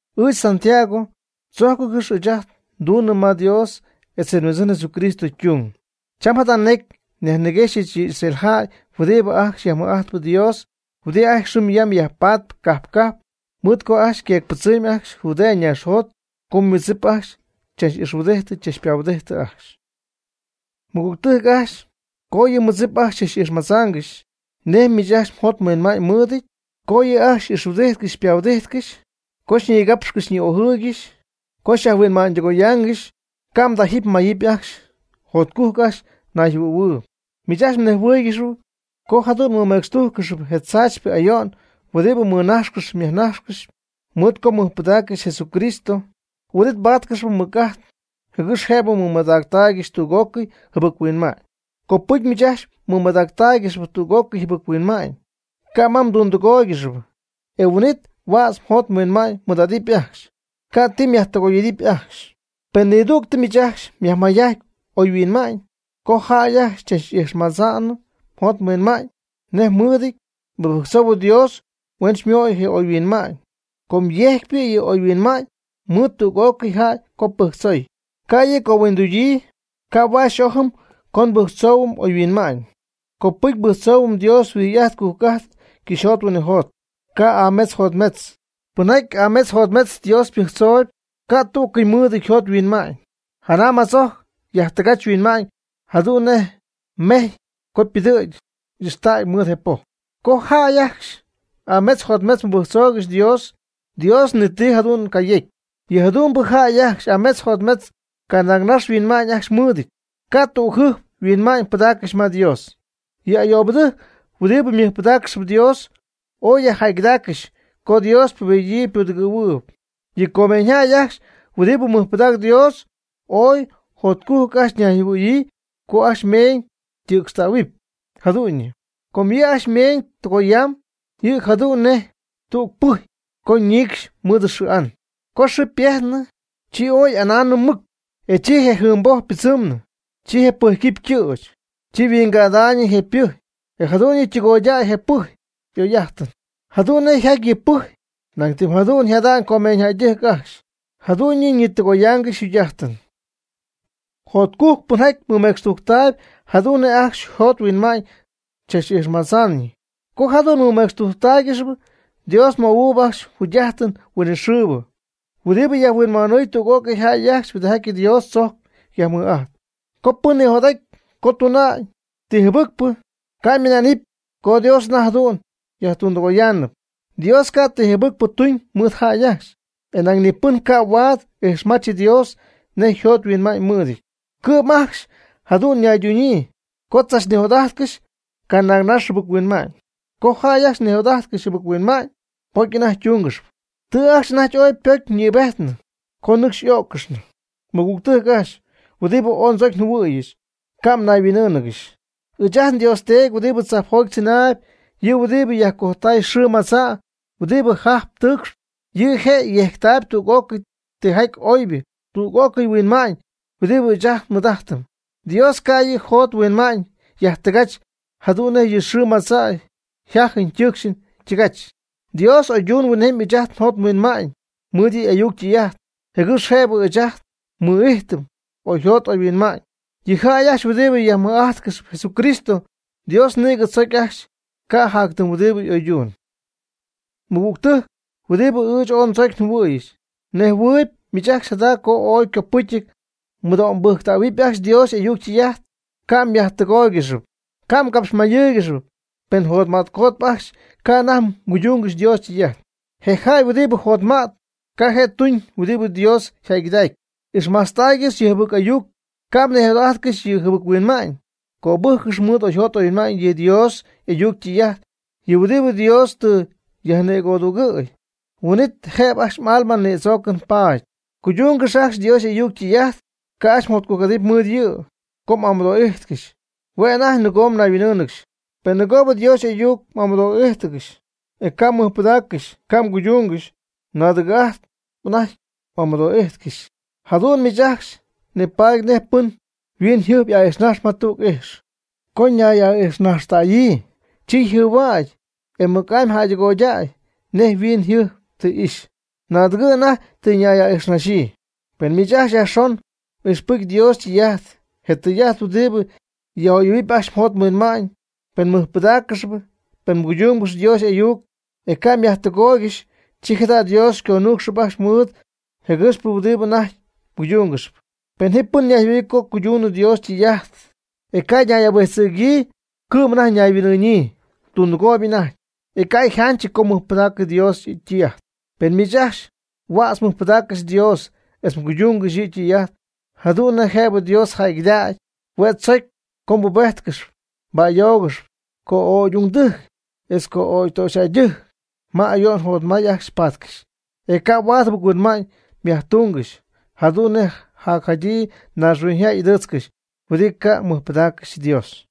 Ɨɨch Santiago, ndzojcɨngɨ́x ɨɨch nduñ ma Dios etz je Huindzɨn Jesucristo ytung. Cham jada necy nyajniguexyɨch yɨ Israel jäy huɨdi ajcxy yajmɨj'ajtp Dios, huɨdi ajcxy xɨm yam yajpatp cajp cajp mɨɨd co yqueecpɨdzɨmy ajcxy Judea naaxjot co ymɨdzip ajcxy chach'ixhuɨdidyii chachpahuɨdidyii ajcxy. Mɨgügtɨjc ajcxy co yɨ mmɨdzip ajcxy xychach'ijxmadzaangɨxy nej miich ajcxy mjot mhuinma'ñ mɨɨdɨty, co yɨ' ajcxy xy'ixhuɨdijtcɨxy xypahuɨdijtcɨxy, co xyñigapxcɨxy xyñi'ojɨɨygɨxy, co xyajhuinma'ñydɨgoyaangɨxy, ca' mdajɨpy mmayɨpy ajcxy, jotcujc ajcxy mnayjɨhuɨ̈huɨɨyb. Miich ajcxy mnejhuɨɨygɨxyp co jadu'n mmɨmecxtujccɨxyp je tzaachypɨ ayo'n huɨdibɨ mmɨnajxcɨxyp myajnajxcɨxyp mɨɨd co tɨ mmɨjpɨdaaccɨxy Jesucristo, huin'it mbáatcɨxɨpy mɨc'ajt, jɨgɨx jëbɨ mɨmadactaygɨxy tüg'ócɨy jɨbɨc-huinma'ñ. Copɨcy miich ajcxy mɨmadactáaygɨxɨpy tüg'ócɨy jɨbɨc-huinma'ñ, ca' ma mdundɨgóoygɨxɨpy, e huin'it huädz mjot mhuinma'ñ mmɨɨd'adɨpy ajcxy, ca' ti myajtɨgoy y'idɨpy ajcxy. Pen nidüg miich ajcxy myajmayjajty oyhuinma'ñ, co jäy ajcxy xychach'ijxmadzaanɨ mjot mhuinma'ñ nej mɨɨdɨty, mɨbɨjctzou Dios huen xymöy je oyhuinma'ñ, com yejcpy yɨ' oyhuinma'ñ mɨɨd tüg'ócɨy jäy co pɨjctzoy. Ca' yɨ' cohuindugyii, ca' huaad xy'ojɨm co nbɨjctzoohuɨm oyhuinma'ñ. Copɨcy pɨjctzohuɨ Dios huijy'ajt cujc'ajt cɨxyjot huinɨjot, ca' y'ametz yjotmetzɨty. Pɨnjaty ametz jotmetz Dios mɨbɨjctzoob, ca' tú'cɨy mɨɨdɨty yjot yhuinma'ñ, janam jatzojc yajtɨgach yhuinma'ñ jadu'n nej je mejy co ypɨdɨ̈gy y'ixtägy mɨɨd je poj. Co jäy ajcxy ametz jotmetz mɨbɨjctzoogɨxy Dios, Dios ni ti jadu'n cayecy. Yɨ jadu'mbɨ jäy ajcxy ametz jotmetzpɨ canaagnax yhuinma'ñ ajcxy mɨɨdɨty, ca' tügjɨjp yhuinma'ñ pɨdaaccɨxy ma Dios. Yɨ ayoobɨtɨjc huɨdibɨ mɨjpɨdaaccɨxyp Dios, ooy jäygɨdägaangɨxy co Dios ypubedɨɨyb ypudɨgɨ̈huɨɨyb. Yɨ comeeñyjäy ajcxy huɨdibɨ mɨjpɨdaacp Dios, ooy jotcujc ajcxy ñayjɨhuɨ̈hua'nyii co ajcxy ymeeñ ytɨ̈cxtähuɨpy jadu'ñyɨ. Com yɨ' ajcxy ymeeñ tɨgoyamb yɨ' jadu'n nej tüg pɨjy co ñiicxnɨ mɨɨd xɨɨ an. Co xɨɨ ypejtnɨ, chi ooy y'andaacnɨ mɨc, e chi je jɨɨnboj ypɨdzɨmy, chi je pɨjyquipy ytɨ̈ch, chi yhuingädaayñɨ je pɨjy, e jadu'ñyɨ ytɨgoydäy je pɨjy oy'ajtɨn. Jadu'n nej yjaty yɨ pɨjy, ñan tɨm jadu'n yjada'ñ comeeñydɨjc ajcxy, jadu'ñyɨ ñitɨgoyaangɨxy yjugy'ajtɨn. Jotcujc pɨnjaty mɨmecxtujctaayb jadu'n nej ajcxy yjot yhuinma'ñ chach'ijxmadza'ñyii. Co jadu'n mɨmecxtujctáaygɨxɨpy, Dios möhuɨɨb ajcxy jugy'ajtɨn huinɨxɨɨbɨ, huɨdibɨ yajhuinhuanɨɨy tüg'ócɨy jäy ajcxy huɨdijaty Dios tzojcp yajmɨj'ajtp. Co pɨn nijot'aty co tuna'ñ ti jɨbɨcpɨ, ca' ymɨna'nɨpy co Dios anajty jadu'n yajtundɨgoyaanɨp. Dios ca' ti jɨbɨcpɨ tuñ mɨɨd jäy ajcxy. E nañ ni pɨn ca' huaad ijxmach Dios nej yjot yhuinma'ñ ymɨɨdɨty. Cɨ'm ajcxy jadu'n ñaydunyii, co tzachnijot'ajtcɨxy canaagnax jɨbɨc-huinma'ñ. Co jäy ajcxy nijot'ajtcɨxy jɨbɨc-huinma'ñ, pocy anajty ytungɨxy. Tɨ ajcxy anajty ooy ypocyñïbejtnɨ co nɨcxy y'ó'ccɨxnɨ. Mɨgügtɨjc ajcxy, huɨdibɨ ooy ndzocy njɨhuɨ̈yɨch, ca' mnayhuin'ɨ́ɨnɨgɨxy. Ɨɨch ajt nDios Teedy huɨdibɨ tzajpjoty tzɨnaayb, yɨ' huɨdibɨ yajcojtaay xɨɨ madza' huɨdibɨ jajp tɨɨcxp, yɨ' je' yejctaayb tüg'ocɨy tijaty oybɨ, tüg'ócɨy yhuinma'ñ huɨdibɨ ɨɨch ajt nmɨɨd'ajtɨm. Dios ca' yɨ' yjot yhuinma'ñ yajtɨgach jadu'n nej yɨ xɨɨ madza' yjajɨn ytɨɨcxɨn ytɨgach. Dios y'oydumyb huinjemy ɨɨch ajt njot nhuinma'ñ mɨɨd yɨ' y'ayuc ytɨy'ajt, jɨgɨx jëbɨ ɨɨch ajt nmɨ'ijtɨm oyjot oyhuinma'ñ. Yɨ jäy ajcxy huɨdibɨ yajmɨj'ajtcɨxp Jesucristo, Dios nïgɨ tzocy ajcxy ca' jac ti huɨdibɨ oyduñ. Mɨgügtɨjc huɨdibɨ ɨɨch ooy ndzocy njɨhuɨ̈yɨch, mnejhuɨ̈huɨpy miich ajcxy jada co ooy ycopɨcyɨty mmɨdo'mbɨjctähuɨpy ajcxy Dios y'ayuc ytɨy'ajt, ca' mjäydɨgóoygɨxɨpy, ca' mgapxmayɨ́ɨygɨxɨpy, pen mjotmätcotp ajcxy ca' anajty mguydungɨxy Dios ytɨy'ajt. Je jäy huɨdibɨ jotma'tp, ca' je' tuñ huɨdibɨ Dios yjäygɨdacyp. Ixmajtztaaygɨx yɨ jɨbɨc ayuc, ca' mnijot'ajtcɨxy yɨ jɨbɨc-huinma'ñ. Cöbɨjccɨx mɨɨd oyjot oyhuinma'ñ yɨ Dios y'ayuc ytɨy'ajt, yɨ huɨdibɨ Dios tɨ yajnicödugɨ̈y, huin'it jëbɨ ajcxy m'alma nïdzoocɨn paady. Cuydungɨx ajcxy Dios y'ayuc ytɨy'ajt, ca' ajcxy mjotcujc'adɨpy mɨɨd yɨ'yɨ co m'amɨdoo'ijtcɨxy, hue' anajty nɨgoo mnayhuin'ɨ́ɨnɨgɨxy. Penɨ nɨgoob Dios y'ayuc m'amɨdoo'ijtcɨxy, e ca' mmɨjpɨdaaccɨxy ca' mguydungɨxy, naadɨgɨ' anajty m'amɨdo'ijtcɨxy. Jadu'n miich ajcxy nipaady nej pɨn yhuiñyjɨjp aa'ijxnajxp ma tügɨ ijx. Co ñay'aa'ijxnajxtäyii, chi yjɨhuägy, e mɨc'amy jäydɨgoydäy nej yhuiñyjɨjp tɨ ixy. Naadɨgɨ' anajty tɨ ñay'aa'ijxnaaxyii. Pen miich ajcxy yajxon m'ixpɨjcyp Dios ytɨy'ajt, je tɨy'ajt huɨdibɨ yaj'oyɨ̈huɨp ajcxy mjot mhuinma'ñ, pen mmɨjpɨdaaccɨxyp, pen mguydungɨxyp Dios y'ayuc, e ca' mjäydɨgooygɨxy, chi jada' Dios xyconuucxɨp ajcxy mɨɨd jëgɨxpɨ huɨdibɨ anajty mguydungɨxyp. Pen ji pɨn ñayjɨhuɨ̈yii co cuydunɨ Dios ytɨy'ajt, e ca' ñay'ahuijtzɨ̈gyii, cɨ'm anajty ñayhuin'ɨɨñyii, tundɨgooyb anajty, e ca' yjanchɨty co mɨjpɨdaacɨ Dios ytɨy'ajt. Pen miich ajcxy huädz mɨjpɨdaaccɨxy Dios etz mguydungɨxy yɨ' ytɨy'ajt jadu'n nej jëbɨ Dios jäygɨdägy, hue' tzocy co mbubéjtcɨxɨpy mba'ayóogɨxɨpy co'ögy'ungdɨjc, etz co'ögy ytöxyjäydɨjc ma ayo'n jotmay ajcxy patcɨxy. E ca' huaad jɨbɨc-huinma'ñ mjactungɨxy, jadu'n nej jadyii naaxhuiñyjäy y'ɨdɨɨtzcɨxy, huɨdi ca' mɨjpɨdaaccɨxy Dios.